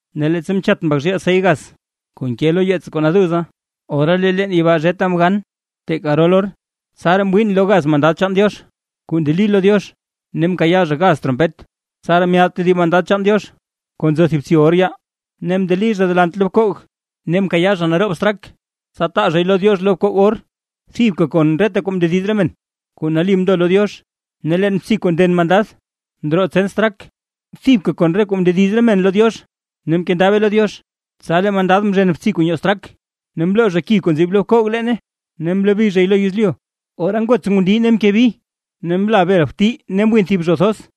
Ne leettsa mchat Mbak zhiil sey gaz kuu nke lo yeets kuu naduza, ora lee leen yibaa zheta mgan teeka garol or. Tsaraa mwiin lo gaz mandad chaan Diox kuu ndeli lo Diox, ne mkayaa zha gaz trompet. Tsaraa myaad tedib mandad chaan Diox kuu nzo thib btsi or yaa, ne mndeli zha delant lo bkoog; ne mkayaa zha naroob straak, tsa taa zhay lo Diox lo bkoog or, thibka kon reta kuu mndediz re men kuu nali mndo lo Diox. Ne leen btsi kuu nden mandad ndroo tsen straak, thibka kon re kuu mndediz re men lo Diox, ne mkendabe lo Diox. Tsa lee mandad mzhen btsi kuu nyoo straak, ne mloo zha ki kuu nzib lo bkoog leene ne mlobi zhay lo yezlyu; ora ngots ngundii ne mke bi, ne mla bel bti ne mwin thib zho thoz.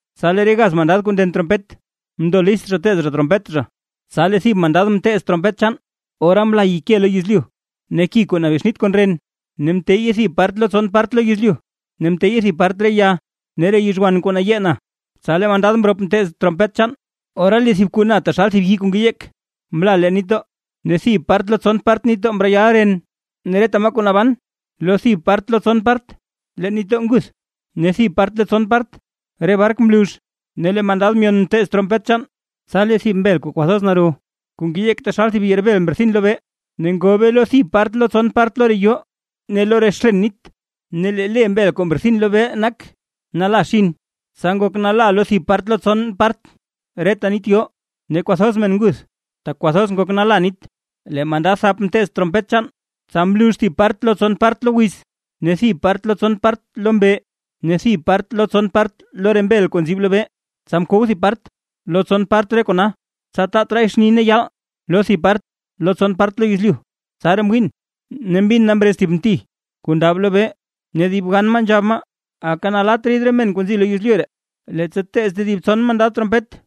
Tsa lee re gaz mandad kuu nden trompet mndo list zha teez zha trompet zha. Tsa lee thib mandad mteez trompet chaan, ora mla yike lo yezlyu ne ki kuu nabexnit kon ren. Ne mteyye thib part lo tson part lo yezlyu, ne mteyye thib part re ya ne re yizhwan kuu nayee na. Tsa lee mandad mrop mteez trompet chaan, ora lee thib kuu na taxal thib yii kuu ngeyeek mla leen nitdoo, ne thib part lo tson part nitdoo mreyal ren. Ne reta maa kuu naban lo thib part lo tson part leen nitdoo nguth, ne thib part lo tson part re bark mlux. Ne lee mandad myon mteez trompet chaan, tsa lee thib mbel kuu kwathoz naro, kuu ngeyeek taxal thib yerbel mrethin lobee. Ne ngobe lo thib part lo tson part lo re yoo ne lo re xlen nit. Ne lee le mbel kuu mrethin lobee nak; nalaxin; tsa ngok nala thib part lo tson part reta nit yoo, ne kwathoz men nguth, tak kwathoz ngok nala nit. Lee mandad thap mteez trompet chaan, tsa mlux thib part lo tson part lo wiz, ne thib part lo tson part lo mbee, ne thib part lo tson part re mbel kuu nzib lobee. Tsa mkow thib part lo tson part re kona, tsa taat raay xni tse ne yaal lo thib part lo tson part lo yezlyu. Tsaraa mwiin, ne mbin na mrez thib mti kuu ndab lobee ne dib gan maa nzhab maa: ―¡Aka nalatt rid re men kuu nzi lo yezlyu ree, leettsa teez tedib tson mandad trompet!